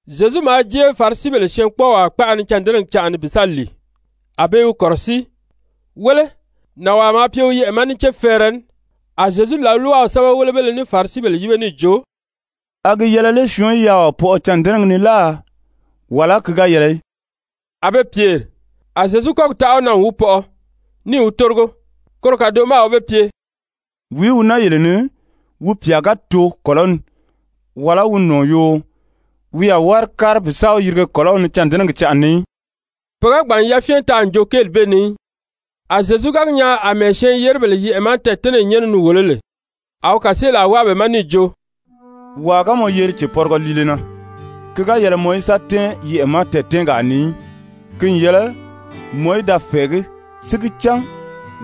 Zyezu maa jée Farisibèle syɛɛnkpɔɔwaa kpaʔa ni cândɛnɛgi canʔa ni bi sa lìi, a be i wi kɔ̀rɔsíi. Wéle, nànwaa maa pye wi yɛʔɛ̀ ma ní céfɛɛrɛ ní, a Zyezu làlwaw sɛ́bɛwelebéle ní Farisibèle yíbe níì jo: «A gi yɛlɛ lé syɔɔn í yaaɔ pɔʔɔ cândɛnɛgi ni láà, wàlá ki ga yɛlɛ í?» A be pyèri. A Zyezu kɔ́gi taʔa wi na n wi pɔʔɔ, níì wi tórigo. Koro kàdoʔo ma a wi be pye: «Wìí wi naa yele ni, wi pyà ga too kɔ̀lɔ́ ni wàlá wi nɔ̀ɔ yoo, wi a wári kári bi sa wi yirige kɔ̀lɔ́w ni cândɛnɛgi canʔa ni í?» Pe ga gbàn n yafyɛn taa n joo kéeli bee ni í. A Zyezu ga gi nyaa àmɛɛ syɛɛn-yeribèle yɛʔɛ̀ ma tɛɛ̀tɛ́nɛyi nyɛ́nɛ ni wòló lè, a wi kàseelaa wáa be ma níì jo: «Wàa ga mɔ yeri cèpɔrigɔ liile na, ki ga yɛlɛ mɔ í sa tɛ́ɛn yɛʔɛ̀ ma tɛɛ̀tɛ́nɛgaa ni í, ki n yɛlɛ mɔ í da fɛ̀ɛgí si gi cán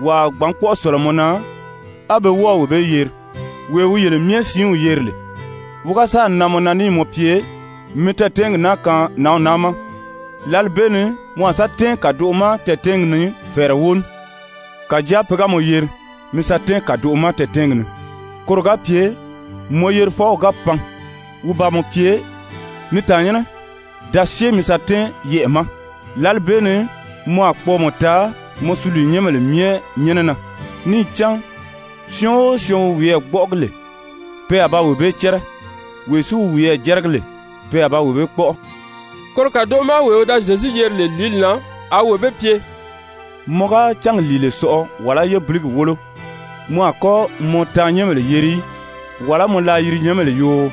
wàa a gbǎn kpɔ́ʔɔ sɔ̀lɔ mɔ na, á be wɔ́ɔ̀ wee bee yeri. Wee wi yele myɛ siinw yeri lè, wi ga sáà nan mɔ na níì mɔ pye: ‹Mi tɛɛ̀tɛnɛgi naa kaan nǎnw naa ma,› lǎli bee ni mɔ a sa tɛ́ɛn kàdoʔo ma tɛɛ̀tɛ́nɛgi ni fɛ̀ɛrɛ wóo ní. Kàjáa pe ga mɔ yeri, mi sa tɛ́ɛn kàdoʔo ma tɛɛ̀tɛnɛgi ni, koro ga pye mɔ yerifɔw ga pan wi ba mɔ pye: ‹Ni tàannyɛnnɛ, da syée mi sa tɛ́ɛn yɛʔɛ̀ ma.› Lǎli bee ni mɔ a kpɔɔmɔ taa mɔ suliinyɛnbèle myɛ nyɛ́nɛ na. Níì cán syɔɔn o syɔɔn wi wiyɛɛ gbɔ́ʔɔgi lè, pe a ba wee bee cɛ́rɛ. Wee si wi wiyɛɛ jɛ́rɛgi lè, pe a ba wee bee kpɔ́ʔɔ.» Koro kàdoʔo ma wee wi da Zyezu yeri lè lìíli na, a wi wee bee pye: «Mɔ ga cángi lìile sɔʔɔ wàlá yébiligi wólo, mɔ a kɔ́ mɔ taannyɛnbèle yeri í, wàlá mɔ laayirinyɛnbèle yoo,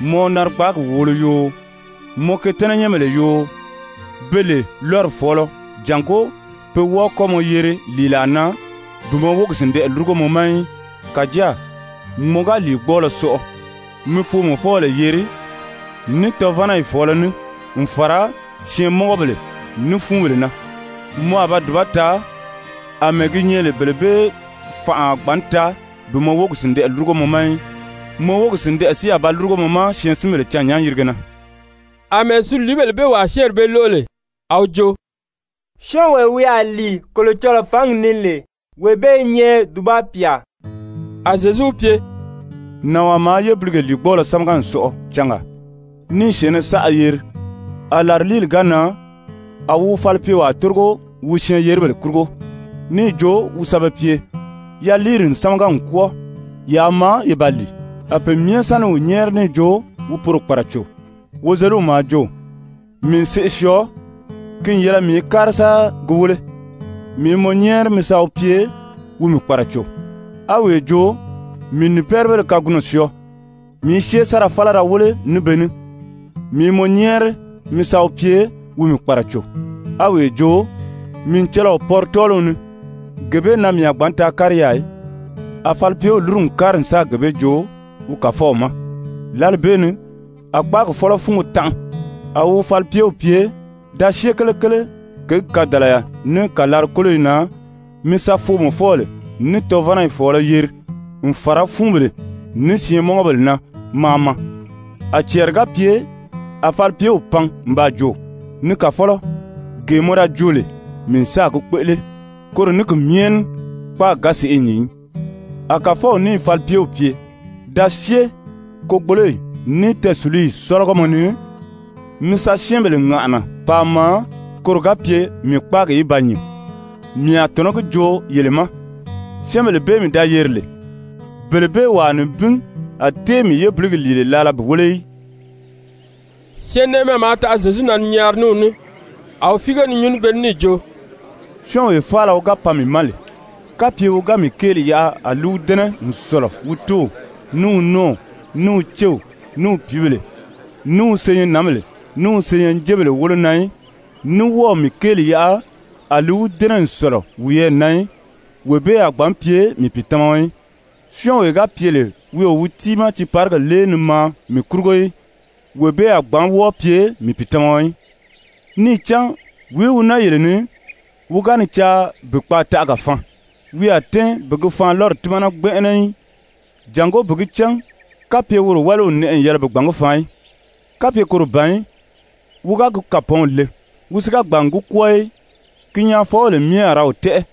mɔ narigbaagi wòolo yoo, mɔ ketɛ́nɛnyɛnbèle yoo, be lè lɔ́ri fɔ̀ɔlɔ, jàngó pe wɔ́ɔ kɔ́ mɔ yeri lìilaa na bi mɔ wógi sìndɛʔɛ lúrugo mɔ ma í. Kàjáa mɔ ga lìigbɔɔlɔ sɔʔɔ, mi foomɔfɔbèle yeri ní tɔvanayi fɔ̀ɔlɔ ní, n fàra syɛɛnmɔngɔbèle ní fúunbèle na. Mɔ a ba dùba taa, àmɛɛ gi nyɛ lè bele bee fánʔa a gbǎn taa bi mɔ wógi sìndɛʔɛ lúrugo mɔ ma í. Mɔ wógi sìndɛʔɛ si a ba lúrugo mɔ ma syɛɛnsinbèle cânnyán-yìrige na.» Amɛɛ suliibèle bee wàa syɛ́ɛnri bee lóʔo lè, a wi jo: «Syɔ́ɔnwee wi a lìi Kolocɔlɔɔ fǎngi ni lè, wee bee i nyɛ dùba pyà!» A Zyezu wi pye: «Nànwaa maa yébilige lìigbɔɔlɔ sámaga n sɔʔɔ cangaa níì syɛ̀ɛnnɛ saʔa yeri. A làriliili ga nan, a wi wi falipyewaa tórigo wi syɛɛn-yeribèle kurugo níì jo wi sa be pye: ‹Yaliiri n sámaga n kwɔ́ɔ, yaa maa ye ba lìi.› A pe myɛ sa ni wi nyɛ́ɛri níì jo wi poro kpàraco. Wozeliw maa jo: ‹Mii n seʔe syɔɔ, ki n yɛlɛ mii í kári sa gi wéle. Mii i mɔ nyɛ́ɛri mi sa wi pye wi mii kpàraco.› A wee jo: ‹Mii n nìpɛɛribéle kagunɔ syɔɔ, mii i syée sa ra fála da wéle ní be ní. Mii i mɔ nyɛ́ɛri mi sa wi pye wi mii kpàraco.› A wee jo: ‹Mii n cɔlɔɔ pɔri tɔ́ɔliw ni, gee bee na mii a gbǎn taa kári yaà í.› A falipyew lúru n kári n sáà gee bee joo wi kàfɔw ma. Lǎli bee ni a kpáagi fɔ́lɔ fúngo tanʔa, a wi wi falipyew pye: ‹Da syée kelekele kěgi kadàlaya ní kàlari-kóloyi na mi sa foomɔfɔbèle ní tɔvanayi fɔ̀ɔlɔ yeri, n fàra fúunbèle ní syɛɛnmɔngɔbèle na maa maa.› A cɛɛri ga pye a falipyew pan n baa jo: ‹Ni kàfɔlɔ, gee mɔ da joo lè, mii n sáà gi kpéʔele, koro ní ki myɛ ní kpáagi ga sèʔê nyìn í.› A kàfɔw níì falipyew pye: ‹Da syée kogboloyi, ní tɛɛsùluyi sɔ́lɔgɔmɔ ni mi sa syɛ́ɛnbèle ŋàʔana paa maa koro ga pye mii kpáagi í ba nyìn. Mii a tɔ̀nɔ́ gi joo yele ma, syɛ́ɛnbèle bee mii da yeri lè, bele bee wàa nibin a tée mii yébiligi lìile laala bi wéle í.›» Syɛɛnnɛʔɛmɛ maa taʔa Zyezu na ni nyaari ní wi ní, a wi fíige ni nyuu ní be ní níì jo: «Syɔ́ɔnwee faala wi ga pan mii ma lè, kapye wi ga mii kéeli yaʔa a li wi dɛ́nɛ n sɔ̀lɔ wi tóow, ní wi nɔ́ɔw, ní wi céw, ní wi pìíbèle, ní wi senyɛnnǎnbèle, ní wi senyɛnjebèle wólo na í, ní wɔ́ɔ̀ mii kéeli yaʔa a li wi dɛ́nɛ n sɔ̀lɔ wiyɛɛ na í, wee bee a gbǎn pye mii pìitamaɔ í. Syɔ́ɔnwee ga pye lè wi o wi tiimaa tiiparigi lée ni maa mii kurugo í, wee bee a gbǎn wɔ́ɔ pye mii pìitamaɔ í. Níì cán wìí wi naa yele ni, wi ga ni caa bi kpaataʔaga faan, wi a tɛ́ɛn bi gi faanlɔri tímana gbɛnʔɛnɛ í, jàngó bi gi cán kapye woro wáliw n nɛʔɛ n yɛlɛ bi gbǎn gi faan í? Kapye koro ban í, wi ga gi kàpɔɔnw le, wi si ga gbàn n gi kwɔ́ɔ í, ki nyaafɔbèle myɛ a ra wi tɛ́ʔɛ,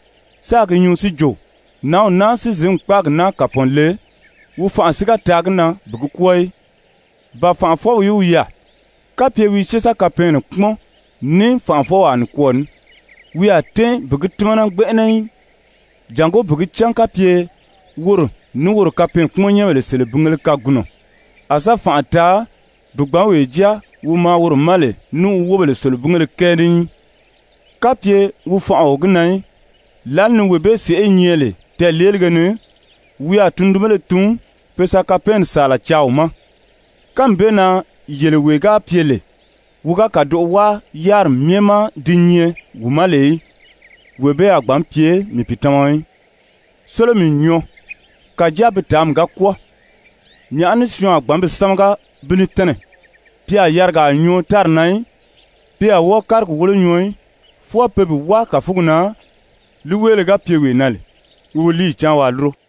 sáā gi nyuu si jo: Nǎnw naa si zǐn kpáagi naa kàpɔɔn le, wi fanʔa si ga taa gi na bi gi kwɔ́ɔ í. Ba fànʔafɔwìí wi yaà, kapye wi i syée sa kapɛɛnnɛ kpúmɔn ní fànʔafɔwaa nikwɔɔ ní, wi a tɛ́ɛn bi gi tímana gbɛnʔɛnɛ í, jàngó bi gi cán kapye woro ní wi kapɛɛnkpumɔnbèle selebingéle kagunɔ a sa fànʔa taa bi gbǎn wee jáa wi maa woro ma lè ní wi wóbèle selebingéle kɛɛ ní í? Kapye wi fanʔa o gi na í, lǎli ni wee bee sèʔé i nyɛ lè tɛɛ̀leelige ni, wi a tundunbéle tun pe sa kapɛɛnni sàala caa wi ma. Kánmi bee na yele wee ga pye lè, wi ga kàdoʔo wáa yáriri myɛ ma di nyɛ wi ma lè í, wee bee a gbǎn pye mii pìitamaɔ í. «Sólomi n nyɔɔ, kàjáa bi tàánmi ga kwɔ́ɔ, nyàʔá ní syɔɔn a bi sámaga bi ní tɛ́nɛ? Pi a yarigaa nyɔɔ tári na í, pi a wɔ́ɔ kárigi wólo nyɔɔ í, fwɔɔ pe bi wáa kàfugi na. Líiweele ga pye wee na lè, wi wi líiyi cáan waa lúro.»